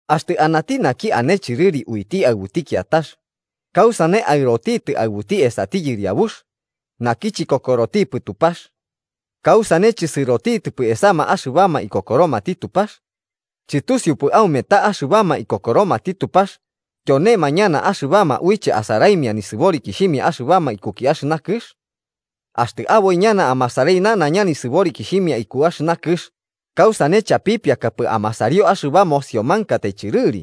Axtɨ anati naki ane chɨrɨri uiti aɨbuti kiatax, ¿kausane aɨrotitɨ aɨbuti esati yɨriabux naki chikokorotipɨ Tupax? ¿Kausane chɨsɨrotitɨpɨ esama axɨbama ikokoromati Tupax? ¿Chɨtusiupɨ aume ta axɨbama ikokoromati Tupax tyonema ñana axɨbama uiche asaraimia nisɨborikixhimia axɨbama ikuki axɨna kɨx? Axtɨ aboi ñana amasarai nanaiña nisɨborikixhimia iku axɨna kɨx, ¿kausane chapipiakapɨ amasario axɨba mosiomankatai chɨrɨri?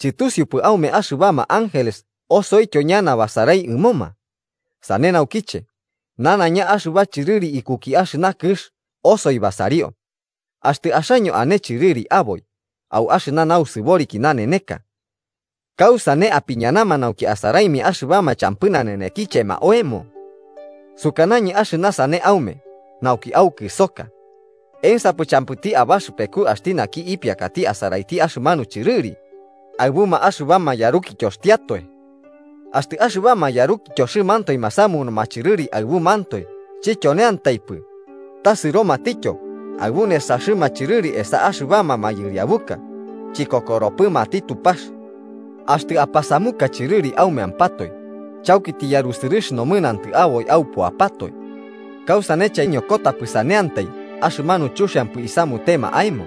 ¿Chɨtusiupɨ aume, axɨbama ángeles osoityo ñana basarai ɨmoma? ¡Sane naukiche nanaiña axɨba chɨrɨri ikuki axɨna kɨx osoi basario! Axtɨ axaño ane chɨrɨri aboi au axɨna nausɨboriki naneneka, ¿kausane apiñanama nauki asaraimia axɨbama champɨ nanenekichema oemo? Sukanañɨ axɨna sane aume nauki aukɨsoka: ¿Ensapɨ champɨti abaxɨpeku axti naki ipiakati asaraiti axɨmanu chɨrɨri aɨbuma axɨbama yarukityoxtiatoe? ¡Axtɨ axɨbama yarukityoxɨmantoe masamunuma chɨrɨri aɨbumantoe chityoneantaipɨ, ta sɨromatityo aɨbu nesaxɨma chɨrɨri esa axɨbama mayɨriabuka chikokoropɨmati Tupax! Axtɨ apasamuka chɨrɨri aumeampatoe, chauki tiyarusɨrɨx nomɨnantɨ aboi aupuapatoe. ¿Kausane chaiñokotapɨ saneantai axɨmanu chuxiampɨ isamutema aemo?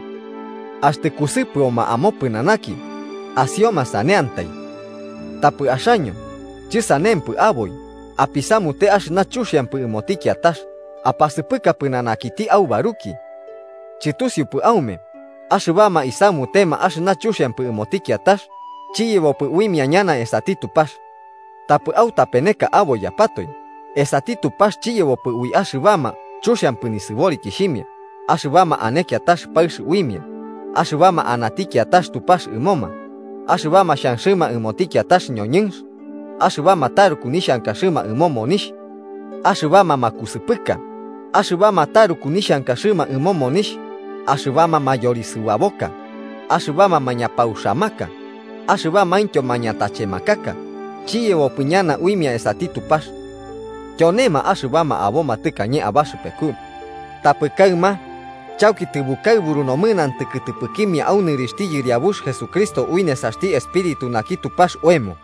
Axtɨ kusɨpɨoma omopɨnanaki amasiosaneantai. ¡Tapɨ axaño, chɨsanempɨ aboi, apisamute axɨna chuxiampɨ ɨmoti kiatax apasɨpɨka pɨnanakiti aubaruki! ¿Chɨtusiupɨ aume axɨbama isamutema axɨna chuxiampɨ ɨmoti kiatax, chiyebopɨ uimia ñana esati Tupax? Tapɨ autapeneka aboiyapatoe, esati Tupax chiyebopɨ ui axɨbama chuxiampɨ nisɨborikixhimia, axɨbama ane kiatax paɨx uimia, axɨbama anati kiatax tupax ɨmoma, axɨbama xhanxɨma ɨmoti kiatax ñoñɨnx, axɨbama taruku nixhankaxɨma ɨmo monixh, axɨbama makusɨpɨka, axɨbama taruku nixhankaxɨma ɨmo monixh, axɨbama mayorisɨbaboka, axɨbama mañapauxamaka, axɨbamaintyo mañatachemakaka, chiyebopɨ ñana uimia esati Tupax. Tyonema axɨbama aboma tɨkañe abaxɨpeku. Tapɨ kaɨma chauki tɨbukaɨburu nomɨnantɨ kɨtɨpɨkimia au nɨrixhti Yɨriabux Jesucristo ui nesaxti Espíritu naki Tupax oemo.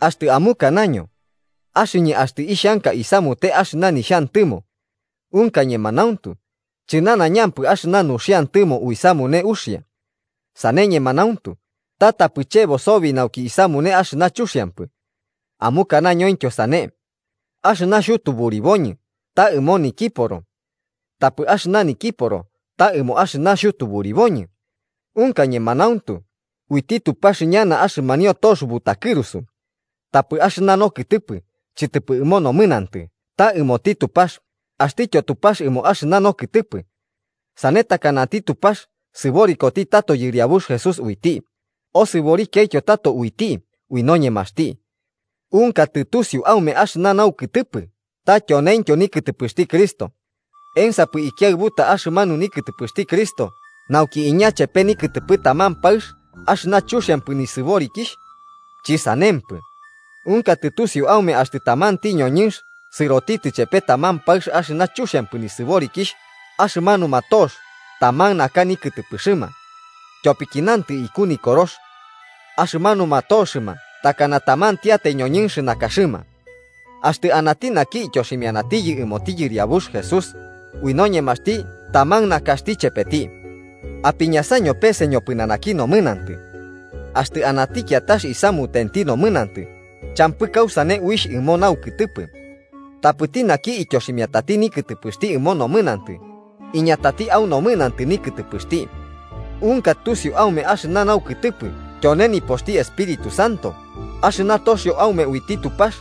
Axtɨ amukanaño: “Axɨñɨ axtɨ ixhanka isamute axɨna nixhantɨmo.” Unka ñemanauntu, chɨnanaiñampɨ axɨna nuxiantɨmo uisamune uxia. Sane, ñemanauntu, ta tapɨ chebo sobi nauki isamune axɨna chuxiampɨ. Amukanañointyo sane: “Axɨna xhutuburiboñɨ ta ɨmo nikiporo, tapɨ axɨna nokiporo ta ɨmo axɨna xhutuburiboñɨ.” Unka ñemanauntu, uiti Tupax ñana axɨmanio tox butakɨrusu. Tapɨ axɨna nokɨtɨpɨ chɨtɨpɨ ɨmo nomɨnantɨ ta ɨmoti Tupax, axtityo Tupax ɨmo axɨna nokɨtɨpɨ. Sane takanati Tupax sɨborikoti tato Yɨriabux Jesús uiti, osɨborikiaityo tato uiti ui noñemaxti. ¿Unka tɨtusiu aume axɨna naukɨtɨpɨ ta tyoneintyo nikɨtɨpɨxti Cristo? ¿Ensapɨ ikiaɨbuta axɨmanu nikɨtɨpɨxti Cristo nauki iña chepe nikɨtɨpɨ taman paɨx axɨna chuxiampɨ nisɨborikixh? ¡Chɨsanempɨ! ¿Unka tɨtusiu aume axtɨ tamanti ñoñɨnx sɨrotitɨ chepe taman paɨx axɨna chuxiampɨ nisɨborikixh, axɨmanuma tox taman naka nikɨtɨpɨxɨma? Tyopiki nantɨ iku Nikorox: “Axɨmanuma toxɨma takana tamantiatai ñoñɨnx nakaxɨma.” Axtɨ anati naki ityoximianatiyɨ ɨmoti Yɨriabux Jesús, ui noñemaxti taman nakaxti chepeti. Apiñasaño pese ñopɨnanaki nomɨnantɨ. Axtɨ anati kiatax isamutenti nomɨnantɨ, champɨ kausane uixh ɨmo naukɨtɨpɨ. Tapɨti naki ityoximiatati nikɨtɨpɨxti ɨmo nomɨnantɨ, iñatati au nomɨnantɨ nikɨtɨpɨxti. ¿Unka tusiu aume axɨna naukɨtɨpɨ tyone nipoxti Espíritu Santo axɨna toxio aume uiti Tupax,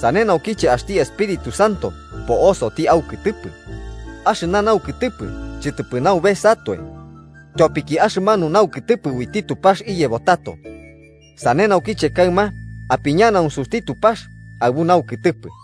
sane naukiche axti Espíritu Santo po'osoti aukɨtɨpɨ? Axɨna naukɨtɨpɨ chɨtɨpɨ naubesatoe, tyopiki axɨmanu naukɨtɨpɨ uiti Tupax iyebo tato. Sane naukiche kaɨma apiñanaunsuti Tupax aɨbu naukɨtɨpɨ.